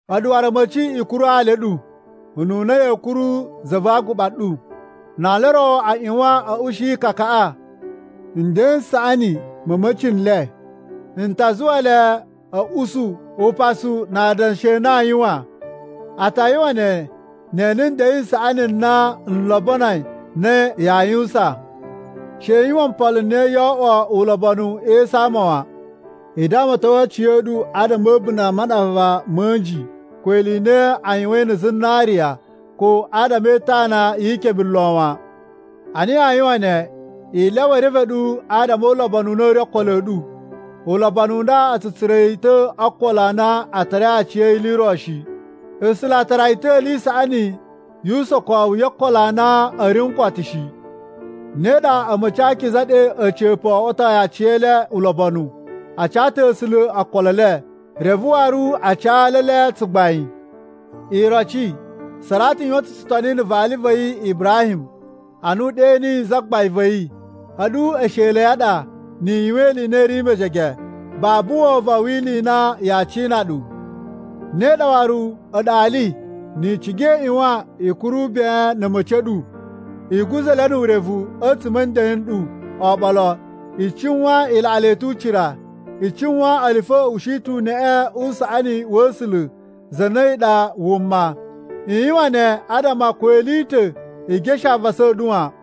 A̱ɗu waru a̱ma̱ci, i kuru ali a̱ ɗu, ununa ya̱a̱ kuru Za va Aguɓa ɗu. Na ali o ro a ꞌyuwan a̱ ushi ikakaꞌa, nden n saꞌani ma̱ a̱ma̱ci n le n ta zuwa le a̱ usu upasu na adanshi a na aa yuwan. A ta yuwan ne, ne e ene nden n saꞌani n na n lobonoi na yaa yuwusan. She i yuwan mpolo n na yoo oꞌwo ulobonu e esu a ama wan. I damaton aciya̱ɗu adama a̱ a̱bunda̱ a maɗava ma̱ a̱nji ko ili i na a yuwain na̱ zinariya ko adama e itana yi ikebe lo wan. Ana yaa yuwan ne, i lyawa e reve ɗu adama o ulobonu u na u ri o okolo a̱ ɗu. Ulobonu u nda a̱ tsu tsura̱ yi ta̱ o okolo a na a tarai aciya̱yi ili i ro shi. A̱sula̱ a tara yi ta̱ ili i saꞌani yu usokowu yo okolo a na u ri n koto shi. Ne ɗa a̱ma̱ci a akiza ɗe a̱ca̱pa̱ o oꞌwotoi aciyele ulobonu. A ca ta̱ A̱sula̱ okolo e le, reve waru a ca ali e le tsugbain. Iroci, Saratu yuwan ta̱ tsutoni na̱ vali va̱ yi Ibrahim, ana u ɗe niyi zagbain va̱ yi. A̱ɗu esheli a̱ yi a ɗa ni i yuwan ili i na i ri mejege babu wovon wi ili i na yaa cina ɗu. Ne ɗa waru, a̱ɗu ali ni i ciga i ꞌyuwan i kuru ben na̱ a̱ma̱ci a̱ ɗu. I guza̱ le nu urevu a̱tsuma̱ a̱ nden n ɗu oɓolo. I cuwan i laꞌa le ta̱ ucira. I cuwan ele fo a̱ ushi ta̱ uneꞌe u saꞌani wa̱ A̱sula̱ za na a̱yi ɗa wuma. I yuwan ne adama ko ili i ta̱ i geshe avasa a̱ ɗu wan.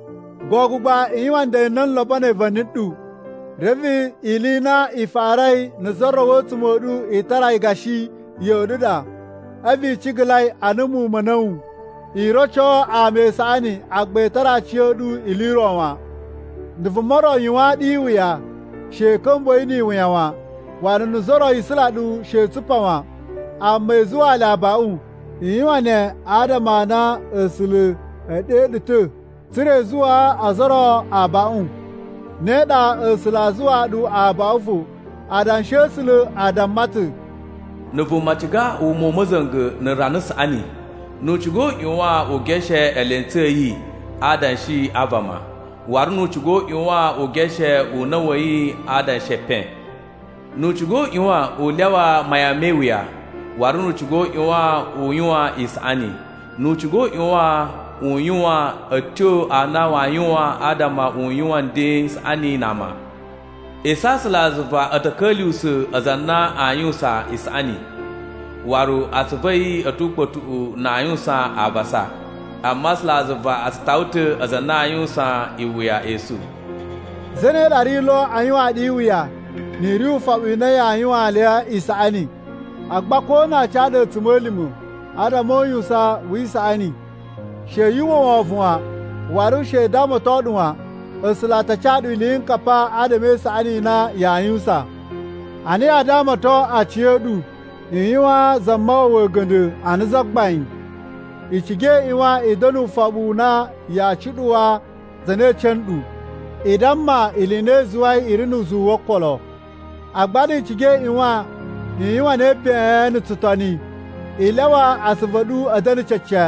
Gogo gba, i yuwan nden n na n lobonoi va̱ni ɗu, reve ili i na i farai na̱ za ro a̱tsuma̱ a̱ ɗu i tara yi gashi ya̱ꞌa̱ ɗu ɗa, a̱vu i cigalai ana muwun ma̱ a̱na̱wu. I roco ama isaꞌani agba i tara aciya̱ɗu ili i ro wan. Na̱ vuma ro yuwaan ɗu iwuya, she i ka̱mbuwa̱ yi ni iwuya wan. Waru na̱ za ro isula ɗu, she i tsupa wan. Amma i zuwaa le abaꞌun. I yuwan ne adama a na A̱sula̱ e ɗe ɗu ta̱ tsa̱ra̱ i zuwaa ozo o ro abaꞌun. Ne ɗa A̱sula̱ aa zuwaa ɗu abaꞌun fo. Adanshi a̱ A̱sula̱ a damma ta̱: “Na̱ vuma ciga wuma u ma̱za̱nga̱ na̱ rana saꞌani, nu u ciga u ꞌyuwan u geshe eelentsu a̱ yi a adanshi a vama, waru nu u ciga u ꞌyuwan u geshe una̱ wa̱ yi a adanshi e epen. Nu u ciga u ꞌyuwan u lyawa mayan me iwuya, waru nu u ciga u ꞌyuwan u yuwan isaꞌani. Nu u ciga u ꞌyuwan u yuwan a̱tyo a na waa yuwan adama u yuwan nden n saꞌani na ama. Esu a̱ A̱sulazuva a̱ ta̱ ka̱lyuwusa̱ aza a na aa yuwusan isaꞌani, waru atsuvu a̱ yi a̱ tu ukpa̱tuꞌu na aa yuwusan avasa. Amma A̱sulazuva a tsu tawa ta̱ aza a na aa yuwusan iwuya esu.” Zane ɗa ri lo aa yuwaan ɗu iwuya, ni i ri ufoɓu na yaa yuwaan le isaꞌani? Agba ko na aa ca ɗu a̱tsuma̱lima̱ adama o uyuwusan wi isaꞌani, she yu uwwa wovon wan, waru she u damaton ɗu wan. A̱sula̱ a ta ca ɗu iliyinkapa adama e isaꞌani i na yaa yuwusan. Ana yaa damaton aciya̱ɗu, i yuwaan Zamawawa a̱ga̱nda̱ ana Zagbain. I ciga i ꞌyuwan i da̱na̱ ufoɓu u na yaa cuɗuwa za na ece nɗu, i damma ili i na i zuwai i ri nu uzuwu wo okolo. Agba ni i ciga i ꞌyuwan i yuwan ne ben na̱ tsutoni. I lyawa asuvu a̱ ɗu a̱ da̱na̱ cece.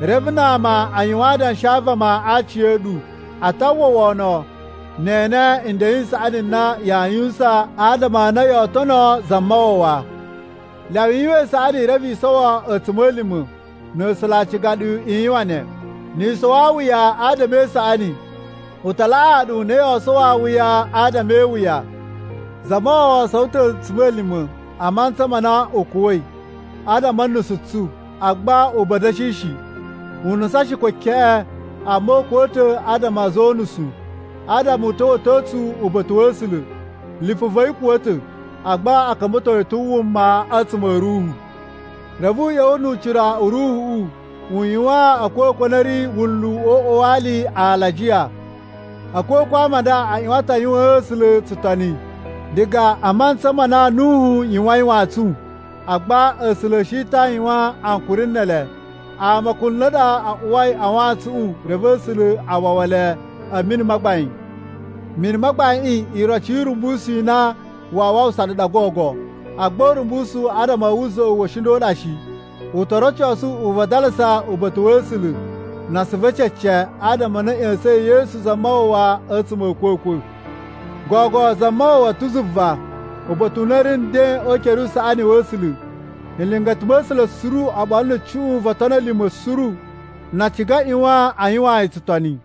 Reve na ama a yuwan adanshi a vama a aci a̱ ɗu, a ta uwwa wono, ne e ene nden n saꞌani n na yaa yuwusan adama a na yoo tono Zamawawa. Lyawa i yuwan isaꞌani reve i sowo a̱tsuma̱lima̱, na̱ A̱sula̱ a ciga ɗu i yuwan ne. Ni i sowo awuya adama e isaꞌani, u ta laꞌaa ɗu a na yoo sowo awuya adama e iwuya. Zamawawa sowo ta̱ a̱tsuma̱lima̱ a mantsa ma na u kuwa̱i adama a̱ nusu tsu, agba u buwa a̱ da̱shi shi. U nusan shi ko keꞌen, amma u kuwa̱ ta̱ adama a̱ a̱za̱ o unusu adama u ta̱wa̱to tsu uba̱ta̱ wa̱ A̱sula̱. Lipu va̱ yi kuwa̱ ta̱, agba a̱ ka̱mba̱to yi ta̱ wuma a̱tsuma̱ a̱ Ruhu. Reve u ꞌya̱wa̱ nu ucira u Ruhuꞌu u yuwaan a̱kwa̱kwa̱ a na a̱ ri wunlu o uꞌwa wa ali alajiya. A̱kwa̱kwa̱ a ama a nda a ꞌyuwan ta̱ a yuwaan A̱sula̱ tsutoni diga a mantsa ma na Nuhu yuwain wantsun. Agba A̱sula̱ a̱ shi ta̱ a yuwan ankuri ne ele. Ama kunla̱ ɗa a uwai a wantsuꞌun reve A̱sula̱ a wawa le a̱ mini ma gbain. Mini ma gbaiꞌin iroci yu urumbusu u na waa wawusa ɗu ɗa gogo. Agba urumbusu adama a̱ wuza̱ꞌu wa̱ a̱shinda̱ a ɗa shi. U to rocosu uvadalasa uba̱ta̱ wa̱ A̱sula̱ na asuvu e cece, adama a na a̱ ꞌya̱sa̱in Yesu Zamawawa a̱tsuma̱ a̱ a̱kwa̱kwa̱. Gogo Zamawawa ta̱ zuva, uba̱ta̱ u na u ri nden o ukere usaꞌani wa̱ A̱sula̱. Nlingata ma̱ A̱sula̱ suru oɓolo na̱ cuꞌun vo otoni a̱ lima̱ suru na a ciga a ꞌyuwan a yuwaan yi tsutoni.